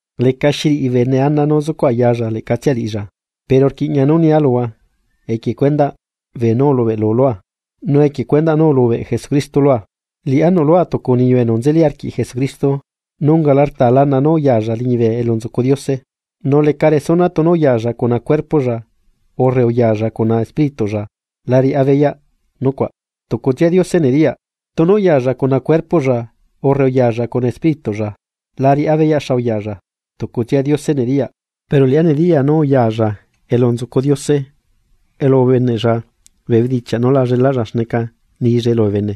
Lecaxi riꞌi bene ana nú sucuꞌ ayalla leꞌcatsia liꞌilla, pero rquiꞌña nú nia luhua equie cuendaꞌ beenú ulubeꞌlu lua, nu equie cuendaꞌ nú ulubeꞌ Jesucristo lua. Liꞌá nuꞌlua tucu niyu enu nzeli arquiꞌ Jesucristo, nu ungala rtaa lana nú uyalla liñibe elu nzucu Diose. Nu leca resuna tunu uyalla cuna cuerpoꞌlla urre uyalla cuna espírituꞌlla la riꞌá beyaꞌ nucuaꞌ tucutsia Diose nediyaꞌ, tunu uyalla cuna cuerpoꞌlla urre uyalla cuna espírituꞌlla, la riꞌá beyaꞌ xa uyalla, tucutsia Diose nediyaꞌ. Pero liꞌá nediyaa nú, uyalla elu nzucu Diose, elu ubeneꞌlla bee bedichiaꞌ nu la llelaꞌlla xneca nillae lubee bene,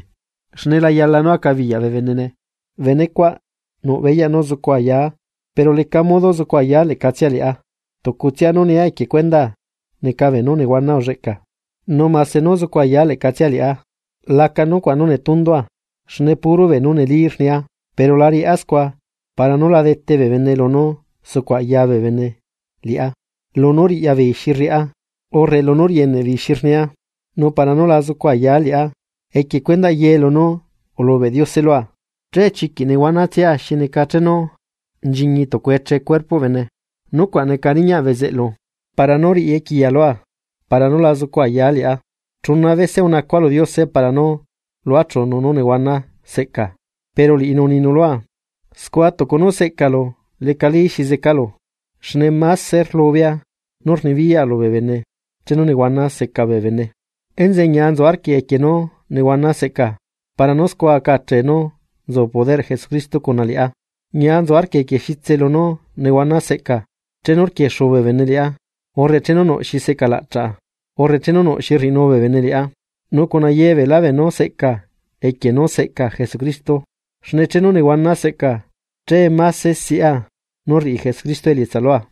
xne la yala nú acabiyaꞌ bee benene. Benecuaꞌ nuꞌ beyaꞌ nú zucu ayaa, pero lecaꞌ modo zucu ayaa leꞌcatsia liꞌá, tucutsia nú nia equie cuendaa neca beenú nehuana ulleꞌca. Nu mase nú zucu ayaa leꞌcatsia liꞌá laca nucuaꞌ nú netundua, xne puro beenú neli rnia, pero la riaꞌa scua para nú la dete bee bene lunú sucuꞌ aya bee bene liꞌá lunú riꞌya beei xi rriꞌá urre lunú rieneꞌbeei xi rnia. Nu para nú la zucu ayaa liꞌá equie cuendaꞌ ye lunú ulubeꞌ Diose lua, che chiquiꞌ nehuana tsiꞌa xi neca chenu nchiñi tucu eche cuerpoꞌ bene. Nucuaꞌ neca riñaꞌ bezeꞌlu para nú riꞌi equiya lua, para nú la zucu ayaa liꞌá. Chuna bese unacua lu Diose para nú luachunu nú nehuana seꞌcaa, pero liꞌinu uninu lua: “Scua tucu nú seꞌcalu lecali xi zecalu, xne máse rlubea nú rnibiyaꞌa lubee bene chenu nehuana seca bee bene.” Enzeꞌe ñia nzu arquia equie nú nehuana seꞌca para nú scua aca achee nú nzu poderꞌ Jesucristo cuna liꞌá. Ñia nzu arquia equie xitse lunú nehuana seꞌca, chenu rquiexu bee bene liꞌá, urre chenu nuꞌ xi secalaꞌchaꞌa, urre chenu nuꞌ xi rriꞌinu bee bene liꞌá, nu cuna ye beelá beenú seꞌca equie nú seꞌca Jesucristo. Xne chenu nehuana seꞌca che máse siꞌa nú rriꞌi Jesucristo elietsa lua.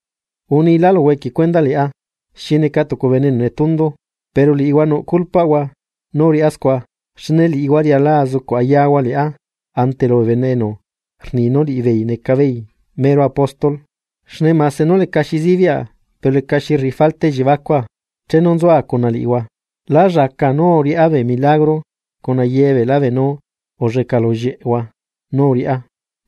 Unila luhua equie cuendaꞌ liꞌá xi neca tucu bene enu netundu, pero liꞌihua nuꞌ culpaꞌhua nú uriꞌá scua. Xne liꞌihua riala azucuꞌ ayahua liꞌá ante lubee bene enu rni nú liꞌibeei neca beei mero apóstol. Xne mase nú lecaxi sibiꞌa pero lecaxi rriꞌi falta elliebacua. Chenu nzua cuna liꞌihua lá llaca nú uriꞌá bee milagro cuna ye beelá beenú ulleꞌca lullieꞌhua nú uriꞌá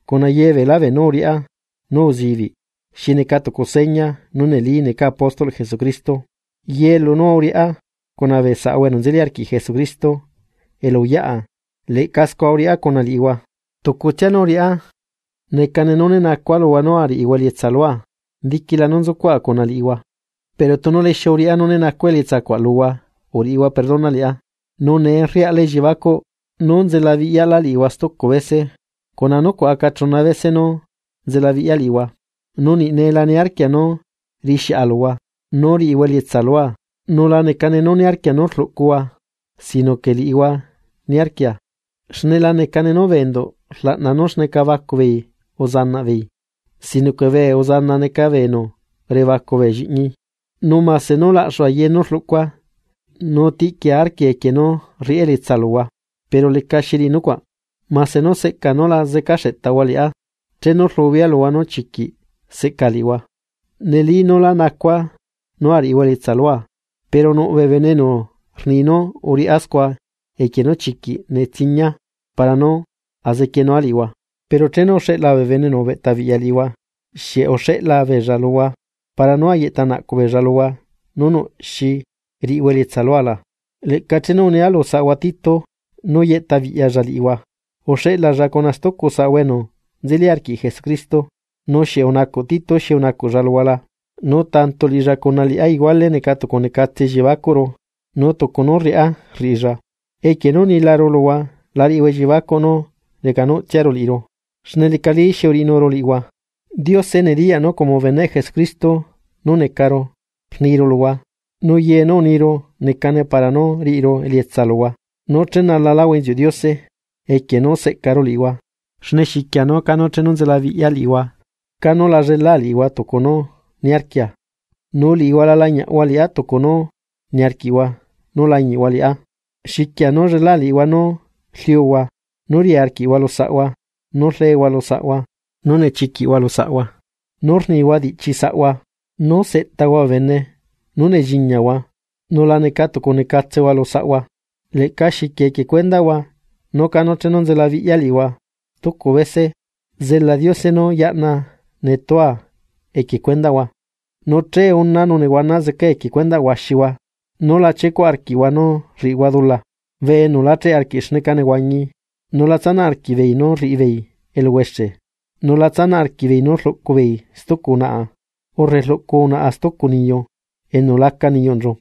cuna ye beelá beenú uriꞌá nú uzibiꞌ xi neca tucu seña nú neli necaa apóstolꞌ Jesucristo. Ye lunú uriꞌá cuna bee saꞌahua enu nzeli arquiꞌ Jesucristo elu uyaꞌa, leꞌca scua uriꞌá cuna liꞌihua. Tucutsia nú uriꞌá neca nú né nacua luhua nú ariꞌihua elietsa lua diquila nú uzucuaꞌa cuna liꞌihua, pero tunu lixiu uriꞌá nú né nacua elietsacuaꞌ luhua uriꞌihua perdona liꞌá. Nu ne rriaꞌlá elliebacuꞌ nú nzelabiꞌyaꞌlá liꞌihua stucu bese, cuna nucuaꞌ aca chuna bese nú nzelabiꞌya liꞌihua. Nu niꞌ ne la niarquia nú riꞌixiꞌa luhua nú riꞌihua elietsa lua nu la necane nú niarquia nú rluꞌcuhua, sino que liꞌihua niarquia; xne la neca nú bee enduꞌ rlaꞌna nú xneca bacu beei uzanaꞌbeei, sino que bee uzana neca bee enu rebacu bee lliꞌñi. Nu mase nú laꞌxua ye nú rluꞌcua nu tiꞌquia arquia equie nú riꞌá elietsa luhua; pero lecaxi riꞌi nucuaꞌ. Mase nú seꞌca nú la zeca xeꞌtahua liꞌá chenu rlubea luhua nú chiquiꞌ seꞌca liꞌihua. Neli nú lá nacua nú ariꞌihua elietsa lua pero nuꞌ bee bene enu rni nú uriꞌá scua equie nú chiquiꞌ netsiñia para nú azequienua liꞌihua. Pero chenu uxeꞌla bee bene enu ubeꞌtabiꞌya liꞌihua, ¿xieꞌ uxeꞌla beella luhua para nú ayeꞌta naꞌcuꞌ beella luhua nú nuꞌ xi riꞌihua elietsa lua la? Leꞌca chenu unia lu saꞌahua Tito nú yeꞌtabiꞌyalla liꞌihua uxeꞌlalla cuna stucu saꞌahua enu nzeli arquiꞌ Jesucristo, ¿nu xieꞌ unacuꞌ Tito xi unacuꞌlla luhua la? Nu tanto liꞌilla cuna liꞌá iguale neca tucu necatse elliebacuꞌru nu tucu nú rriꞌá rriꞌilla. Equie nú unilaru luhua la riꞌihua elliebacuꞌ nú recanuꞌtsiaru liꞌiru, xne lecali xi uriꞌinuru liꞌihua. Diose nediyaꞌ nú como beneꞌ Jesucristo nú necaru rniru luhua, nu ye nú rniru necane para nú riꞌiru elietsa luhua nú chenalaláhua inziuꞌ Diose equie nú seꞌcaru liꞌihua. Xne xiquia nú chenu nzelabiꞌya liꞌihua canu la llelaa liꞌihua tucu nú niarquia, nu liꞌihua la lañiꞌhua liꞌá tucu nú niarquiꞌhua nú lañiꞌhua liꞌá. Xiquia nú llela liꞌihua nú rliuhua, nú ria arquiꞌhua lu saꞌhua, nú rlehua lu saꞌhua, nú nechiquiꞌhua lu saꞌhua, nú rnihua diꞌchi saꞌhua, nú seꞌtahua bee bene, nú nelliñiahua nu la neca tucu necatsehua lu saꞌhua. Leꞌca xiquia equie cuendaꞌhua nú canu chenu nzelabiꞌya liꞌihua stucu bese zela Diose nú yaꞌna netua equie cuendaꞌhua, nu che unaa nu nehuana zecaa equie cuendaꞌ huaxihua nú la chiecuꞌ arquiꞌhua nú rriꞌihua dula, bee enu la cheꞌe arquiꞌ xneca nehuañi, nu la tsanaꞌ arquiꞌbeei nú rriꞌi beei eluhuexe, nu la tsanaꞌ arquiꞌbeei nú rluꞌcu beei stucu unaꞌa, urre rluꞌcu unaꞌa stucu niyu enu laca niyuꞌnchu,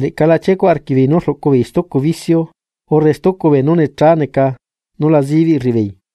leꞌca la chiecuꞌ arquiꞌbeei nú rluꞌcu beei stucu vicio urre stucu beenú necha neca nú la zibiꞌ rriꞌibeei.